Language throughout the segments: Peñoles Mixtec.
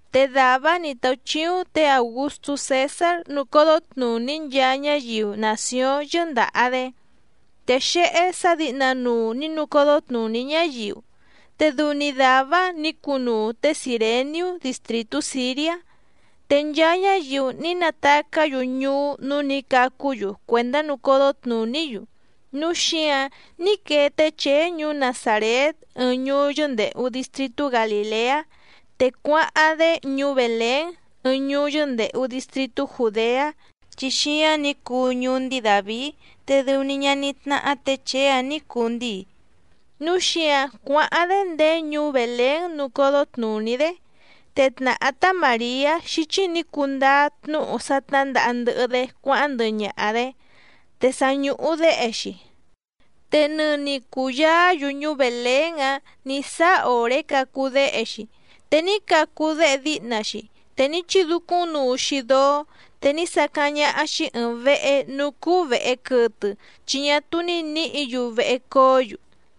Te dàvá‑áⁿ nǐ táúchíúⁿ tě Aùgustú Cèsár nucódó tnùní nchaa ñáyiu nàcióⁿ yɨ́ndàha‑dé. Te xéhé sǎ dǐhnanuu nǐ nucódó tnùní ñáyiu, te dɨu‑ni dàvá‑áⁿ nǐ cunuu té Cìreniú distrìtú Sìriá. Te nchaa ñáyiu ní natacá‑yu ñuú núú nǐ cacú‑yu cuèndá nucódó tnùní‑yu. Núu xíǎⁿ ní quee té Chèé ñuú Nazàrét ɨɨⁿ ñuú yɨ́ndèhu distritú Galìleá, te cuáháⁿ‑dé ñuú Bèlén ɨɨⁿ ñuú yɨ́ndèhu distritú Jùdeá, chi xíáⁿ nǐ cuu ñuú ndíi Dàvií, te dɨu‑ni ñaní tnáhá tě Chèé‑áⁿ nǐ cuu ndíi. Núu xíǎⁿ cuáháⁿ‑dé ndéé ñuú Bèlén nucódó tnùní‑dé, te tnàhá tá Màriá xíchí nǐ cundáá tnúhu sá tnǎndaha ndɨhɨ‑dé cuáháⁿ ndɨhɨ ñaha‑dě, te sa ñùhu déhe‑xi. Te nɨni cùyaá‑yu ñuú Bèlén‑áⁿ nǐ sáá òré cacu déhe‑xi. Te ní cacu déhe díhna‑xi, te ní chidúcúⁿnuu‑xi dóó, te ní sacáⁿ ñáhá‑xí ɨ̀ɨⁿ vehe núú cúú vèhe quɨtɨ, chi ñá túú ní nǐhǐ‑yu vehe coó‑yu.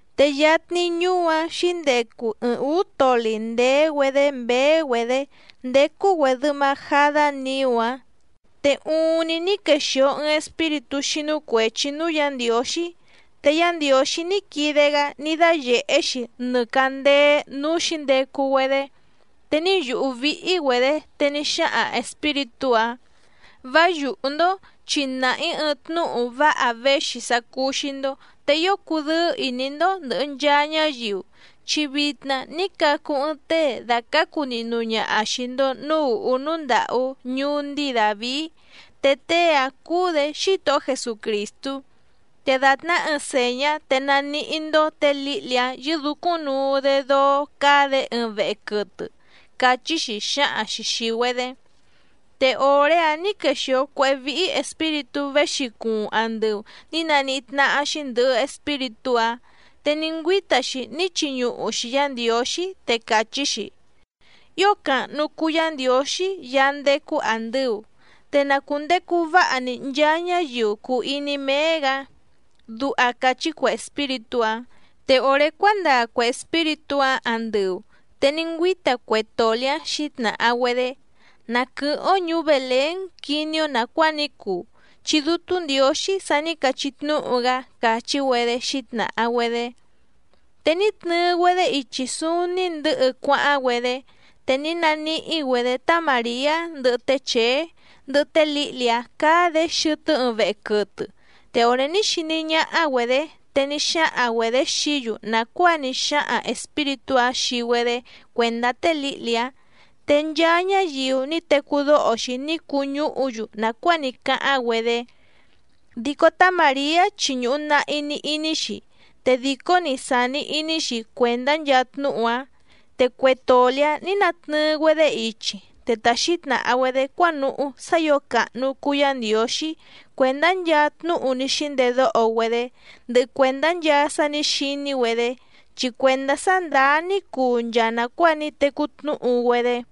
Te yatni ñuú‑áⁿ xǐndecu ɨɨⁿ ǔú toli ndèé‑güedé mběé‑güedě ndécú‑güèdɨ majadá niú‑áⁿ. Te uuⁿni ní quexìo ɨɨⁿ espíritú xínú cuèchi núú Yǎ Ndiǒxí, te Yá Ndiǒxí ní quide‑gá ní dáyèhé‑xi nɨ càndéé núú xǐndecu‑güedé, te ní yùhú víhí‑güedě. Te ní xáhaⁿ espíritú‑áⁿ: —Vá yùhú‑ndó, chi nàha‑í ɨɨⁿ tnúhu váha véxi sá cúú‑xí‑ndó, te ío cudɨ́ɨ́ ìní‑ndó ndɨ̀hɨ nchaa ñáyiu. Chi vitna ní cacu ɨɨⁿ tée dàcácu nihnu ñaha xìi‑ndo núú ùhú núú ndàhú ñuú ndíi Dàvií, te tée‑áⁿ cúú‑dě Xítohó Jesucrìstú. Te dàtná ɨɨⁿ sèñá te naníhí‑ndó tě lǐhli‑áⁿ yɨ́dǔcúⁿ nuu‑dé dóó cáá‑dě ɨɨⁿ vehe quɨtɨ —càchí‑xi xǎhaⁿ‑xi xìi‑güedé. Te òré‑áⁿ nǐ quexìo cuéhé víhí espíritú véxi cuuⁿ andɨu nǐ naníhí tnáhá‑xí ndɨ̀hɨ espíritú‑áⁿ, te ní ngüíta‑xi ní chiñuhu‑xi Yǎ Ndiǒxí, te càchí‑xi: ¡Ío càhnu cuu Yá Ndiǒxí Yaá ndécú àndɨu, te na cùndecu váha‑ni nchaa ñáyiu cùu iní méé‑gǎ! Duha càchí cue espíritú‑áⁿ. Te òré cuándaa cue espíritú‑áⁿ andɨu, te ní ngüíta cue toli‑ǎⁿ xǐtnàha‑güedé: —Na quɨ̀hɨ́ⁿ‑ó ñùú Bèlén quiní‑ó nàcuáa ní cuu, chi Dútú Ndiǒxí sa ní cachí tnúhu‑gá —càchí‑güedé xǐtnàha‑güedé. Te ní tnɨɨ‑güedé ichi súúní ndɨ̌hɨ cuáháⁿ‑güedé, te ní naníhí‑güedě tá Màriá ndɨhɨ té Chèé, ndɨhɨ té lǐhli‑áⁿ cáá‑dě xɨtɨ́ ɨɨⁿ vehe quɨtɨ. Te òré ní xiní ñáhá‑güedě te ní xáhaⁿ‑güedě xií‑yu nàcuáa ní xáhaⁿ espíritú‑áⁿ xii‑güedé cuèndá té lǐhli‑áⁿ. Te nchaa ñáyiu ní tecú dóho‑xi ní cuñúhu‑yu nàcuáa ní cáháⁿ‑güedé. Dico tá Màriá chi ñùhu nahi‑ni iní‑xi, te dìcó‑ni sàni iní‑xi cuèndá nchaa tnúhu‑áⁿ. Te cue toli‑ǎⁿ nǐ natnɨɨ‑güedé ichi, te ta xǐtnàha‑güedé cuánuhú sá ǐo càhnu cuu Yá Ndiǒxí cuèndá nchaa tnúhu ní xíndedóho‑güedé, ndɨhɨ cuèndá nchaa sá nǐ xiní‑güedé, chi cuèndá sá ndàá ní cuu nchaa nàcuáa ní tecú tnúhu‑güedé.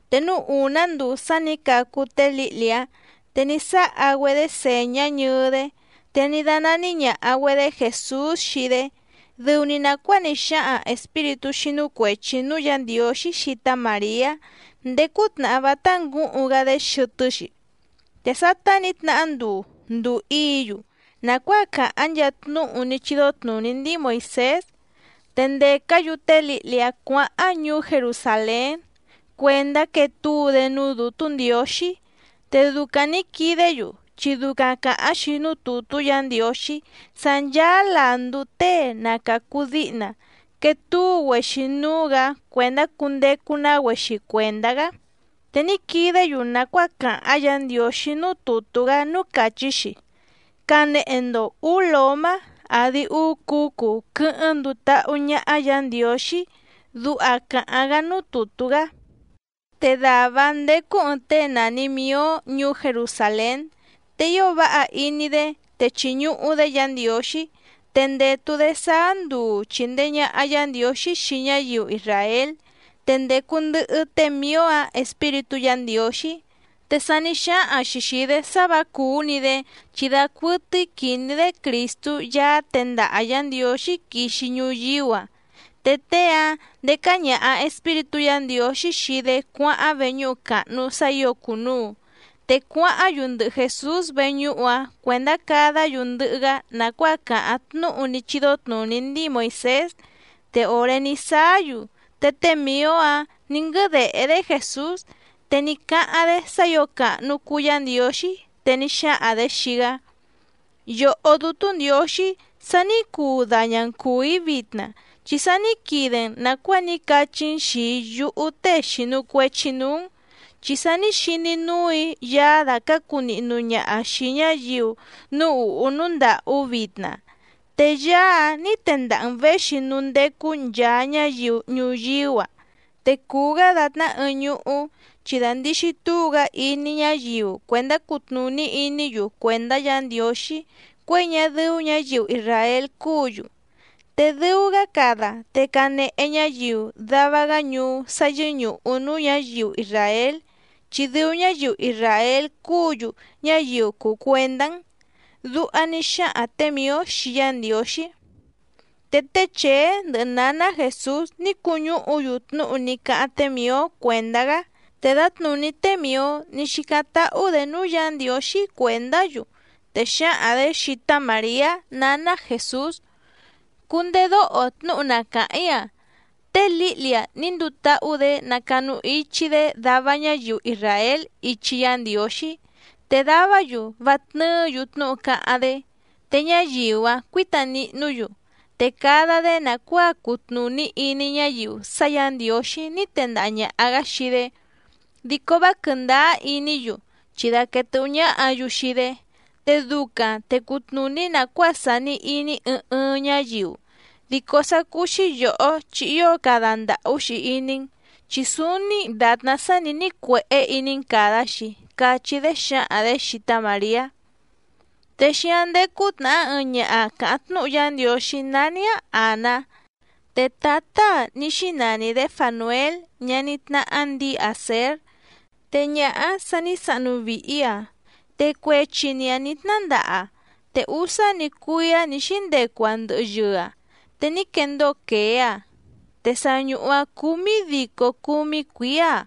Te núú ùná nduu sá nǐ cacu té lǐhli‑áⁿ, te ní sáha‑güedé sèñá ñɨɨ‑dé, te ní dánání ñàha‑güedé Jèsús xii‑dé, dɨu‑ni nàcuáa ní xáhaⁿ espíritú xínú cuèchi núú Yǎ Ndiǒxí xii tá Màriá ndéé cútnàhá vátá ngǔhuⁿ‑gá‑dé xɨtɨ́‑xi. Te sátá nǐ tnahá nduu, ndùu íǐ‑yu nàcuáa càháⁿ nchaa tnúhu ní chídó tnùní ndíi Moìsés, te ndècá‑yu té lǐhli‑áⁿ cuǎháⁿ ñuú Jerusàlén cuèndá quee túu‑dé núú Dǔtú Ndiǒxí. Te ducaⁿ nǐ quidé‑yu, chi ducaⁿ càháⁿ‑xi núú tùtú Yǎ Ndiǒxí sá ncháá làndú tée na càcu díhna quetúu‑güexi núú‑gǎ cuèndá cundecu‑ná‑güexi cuèndá‑gá. Te ní quidé‑yu nàcuáa càháⁿ Yǎ Ndiǒxí núú tùtú‑gá núú càchí‑xi: “Canehe‑ndo ǔú lǒmá àdi úú cǔcu quɨ́hɨ́ⁿ nduu táhú ñáhá Yǎ Ndiǒxí”, duha càháⁿ‑gá núú tùtú‑gá. Te dàvá‑áⁿ ndécú ɨ̀ɨⁿ tée nàni Mió ñuú Jerusàlén. Te ío váha iní‑dé, te chìñuhu‑dé Yǎ Ndiǒxí, te ndètu‑dé sáá nduu chìndee ñaha Yá Ndiǒxí xii ñáyiu isràél. Te ndècu ndɨhɨ té Mìó‑áⁿ Espíritú Yǎ Ndiǒxí. Te sa ní xáhaⁿ‑xi xìi‑dé sá vǎ cùú‑ni‑dé, chi dacuɨtɨ́í quìní‑dé Crìstú Yaá tendaha Yǎ Ndiǒxí quixi ñuyíú‑a. Te tée‑áⁿ ndécá ñàha Espíritú Yǎ Ndiǒxí xii‑dé cuáháⁿ veñúhu càhnu sá ǐo cùnuu. Te cuáháⁿ‑yu ndɨhɨ Jèsús veñúhu‑áⁿ cuèndá cadá‑yu ndɨhɨ‑gá nàcuáa càháⁿ tnúhu ní chídó tnùní ndíi Moìsés. Te òré ní sáá‑yu, te té Mìó‑áⁿ nǐ nguɨ́dèhé‑dé Jèsús, te ní cáháⁿ‑dé sá ǐo càhnu cuu Yá Ndiǒxí, te ní xáhaⁿ‑dě xii‑gá: Yòhó Dútú Ndiǒxí sa ní cuu daña‑n cùú‑í vitna, chi sa ní quide‑n nàcuáa ní cachí‑n xìi yúhú tée xìnu cuechi núú‑n. Chi sa ní xiní núù‑í Yaá dàcácu nihnu ñaha xìi ñáyiu núú ùhú núú ndàhú vitna. Te Yaá ní tendaha‑n věxi núú ndécú nchàa ñáyiu ñuyíú‑a. Te cùu‑gá dàtná ɨɨⁿ ñuhú, chi dandìxi túu‑gá iní ñáyiu cuèndá cutnùní iní‑yu cuèndá Yǎ Ndiǒxí cuěi ñá dɨ́ú ñǎyiu isràél cúǔ‑yu. Te dɨu‑gá cada, te canehe ñáyiu dava‑gá ñuú sá yɨ́ñùhu núú ñǎyiu isràél chi dɨu ñáyiu isràél cúǔ‑yu ñáyiu cùu cuendá‑n. Duha ní xáhaⁿ tě Mìó xii Yá Ndiǒxí. Te té Chèé ndɨhɨ nǎná Jèsús ní cuñúhu‑yu tnúhu ní cáháⁿ té Mìó cuèndá‑gá. Te dǎtnùní té Mìó ní xícáⁿ táhú‑dě núú Yǎ Ndiǒxí cuèndá‑yu, te xǎhaⁿ‑dě xii tá Màriá nǎná Jèsús: —Cundedóho tnúhu na càháⁿ‑í‑a, té lǐhli‑a ní nduu táhú‑dě nacanu ichi‑dé dava ñáyiu isràél ichi Yá Ndiǒxí, te davá‑yu vá tnɨ́ɨ̌‑yu tnúhu cáháⁿ‑dé, te ñáyiu‑áⁿ cuǐta nihnú‑yu, te cada‑dé nàcuáa cutnùní iní ñáyiu sá Yǎ Ndiǒxí ní tendaha ñàha‑gá xii‑dé, dico vá quɨ̀ndáá iní‑yu, chi daquèe tɨ́hú ñáhǎ‑yu xii‑dé. Te ducaⁿ te cutnùní nàcuáa sàni iní ɨɨⁿ ɨɨⁿ ñáyiu. Dico sá cúú‑xí yòhó chi ío cada ndàhú‑xi iní‑n, chi súúní dàtná sá nǐ nícuèhé iní‑n càda‑xi —cachí‑dé xǎhaⁿ‑dě xii tá Màriá. Te xíáⁿ ndécú tnàhá ɨɨⁿ ñaha càháⁿ tnúhu Yá Ndiǒxí nání‑áⁿ Àná, te tǎtá‑aⁿ ní xínani‑dě Fànuél ñaní tnáhá ndǐi Àsér. Te ñaha‑áⁿ sa ní sahnu vìhi‑aⁿ, te cuechi‑ni‑aⁿ nǐ tnándaha‑aⁿ te úsá‑ni cuíá nǐ xíndecu‑aⁿ ndɨhɨ yɨɨ‑aⁿ, te ní quendóo quèé‑aⁿ, te sa ñùhu‑aⁿ cúmídícó cǔmí cuǐá‑aⁿ.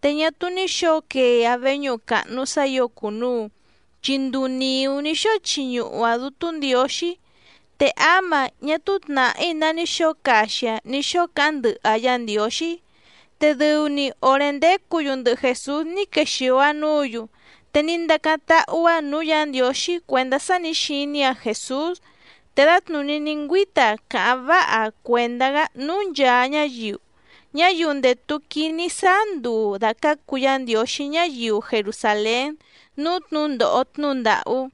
Te ñá túú ní xǒo quee‑aⁿ veñúhu càhnu sá ǐo cùnuu, chi nduu nìú ní xóo chiñuhu‑aⁿ Dútú Ndiǒxí, te áma ñá túú tnàhí ná ní xǒo caxi‑aⁿ ní xóo cáháⁿ ndɨhɨ‑aⁿ Yá Ndiǒxí. Te dɨu‑ni òré ndécǔ‑yu ndɨhɨ Jèsús ní quexìo‑aⁿ núǔ‑yu, te ní ndacáⁿ táhú‑áⁿ nǔú Yǎ Ndiǒxí cuèndá sá nǐ xiní‑aⁿ Jèsús, te dǎtnùní ní ngüíta‑aⁿ càháⁿ váha‑aⁿ cuèndá‑gá núú nchàa ñáyiu, ñáyiu ndètu quiní sáá nduu dàcácu Yá Ndiǒxí ñáyiu Jerusàlén núú tnǔndòho tnúhu ndàhú.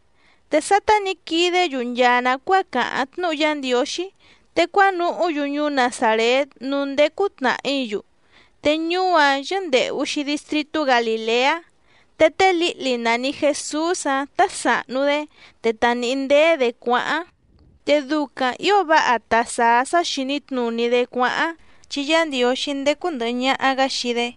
Te sátá nǐ quidé‑yu nchaa nàcuáa càháⁿ tnúhu Yá Ndiǒxí, te cuánuhú‑yu ñuú Nazàrét núú ndécú tnàhí‑yu, te ñuú‑áⁿ yɨ́ndèhu‑xi distritú Galìleá. Te té lǐhli nàni Jesús‑áⁿ tá sàhnu‑dé, te ta nìhí ndéé‑dě cuáháⁿ, te ducaⁿ ǐo váha ta sàá sá xìní tnùní‑dé cuáháⁿ, chi Yá Ndiǒxí ndécú ndɨ̀hɨ ñaha‑gá xii‑dé.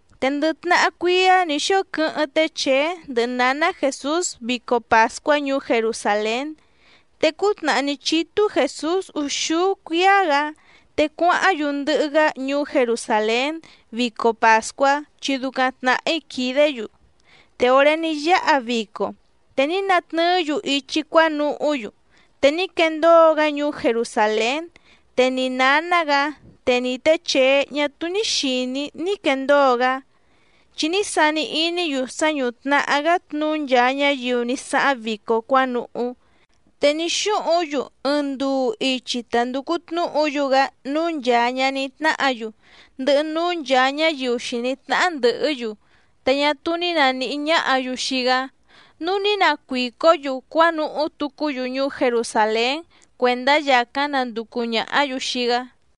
Te ndɨ tnahá cuíá nǐ xóo quɨ́hɨ́ⁿ té Chèé ndɨhɨ nǎná Jèsús vico pàscuá ñuú Jerusàlén. Te cútnàhá ní chítú Jèsús úxúú cuíá‑gǎ, te cuáháⁿ‑yu ndɨhɨ‑gá ñuú Jerusàlén vico pàscuá, chi ducaⁿ tnàhí quìdé‑yu. Te òré ní yáha vico, te ní natnɨɨ́‑yu ichi cuánuhú‑yu, te ní quendóo‑gá ñuú Jerusàlén, te ni nǎná‑gǎ, te ni tě Chèé ñá túú ní xìní ní quendóo‑gá. Chi ní sani iní‑yu sá ñútnàhá‑gá tnuú nchaa ñáyiu ní sáháⁿ vico cuánuhú. Te ní xúhuⁿ‑yu ɨɨⁿ nduu ichi ta ndùcu tnúhu‑yu‑gá núú nchàa ñaní tnáhǎ‑yu, ndɨhɨ núú nchàa ñáyiu xìní tnáhá ndɨ̀hɨ́‑yu, te ñá túú ní nàníhí ñáhǎ‑yu xii‑gá. Núu ní nacuìcó‑yu cuánuhú tucú‑yu ñuú Jerusàlén cuèndá yàcáⁿ nanducu ñàhá‑yu xii‑gá.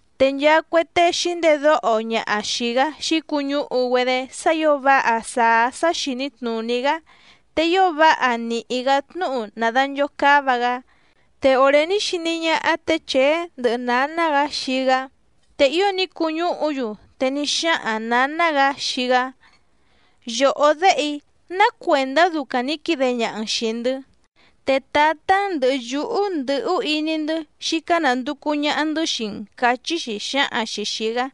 Te nchaa cue tée xǐndedóho ñaha xìi‑gá xǐcuñúhu‑güedé sá ǐo váha sàá sá xìní tnùní‑gá, te ío váha nìhí‑gá tnúhu nàdanchocáva‑gá. Te òré ní xiní ñáhá tě Chèé ndɨhɨ nǎná‑gǎ xii‑gá, te ío ní cuñúhu‑yu, te ní xáhaⁿ nǎná‑gǎ xii‑gá: —Yòhó déhe‑í, ¿ná cuèndá ducaⁿ nǐ quide ñaha‑n xìi‑ndɨ́? Te tǎtá‑n ndɨ̀hɨ yúhú ndɨ̀hú iní‑ndɨ́ xícá nànducu ñaha‑ndɨ́ xii‑n —càchí‑xi xǎhaⁿ‑xi xìi‑gá.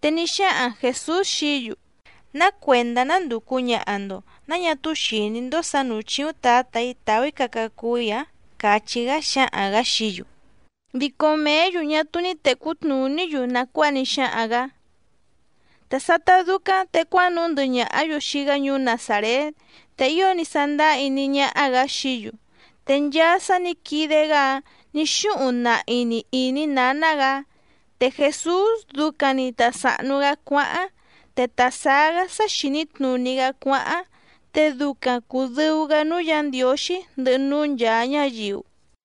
Te ní xáhaⁿ Jèsús xií‑yu: —¿Ná cuèndá nándùcu ñaha‑ndo? ¿Náa ñá túú xìní‑ndó sǎ nǔú chíúⁿ Tǎtà‑í tàú‑í caca cuu‑í‑ǎⁿ? —càchí‑gá xǎhaⁿ‑gǎ xií‑yu. Dico mèé‑yu ñá túú ní tècú tnùní‑yu nàcuáa ní xáhaⁿ‑gǎ. Te sátá dúcáⁿ te cuánuhú ndɨhɨ ñàhá‑yu xii‑gá ñuú Nazàrét, te ío ní sándáá iní ñáhá‑gǎ xií‑yu. Te nchaa sá nǐ quide‑gá‑áⁿ nǐ xúhuⁿ nahi‑ni ìní nǎná‑gǎ. Te Jèsús ducaⁿ‑ni ta sàhnu‑gá cuáháⁿ, te ta sàá‑gá sá xìní tnùní‑gá cuáháⁿ, te ducaⁿ cùdɨu‑gá núú Yǎ Ndiǒxí, ndɨhɨ núú nchàa ñáyiu.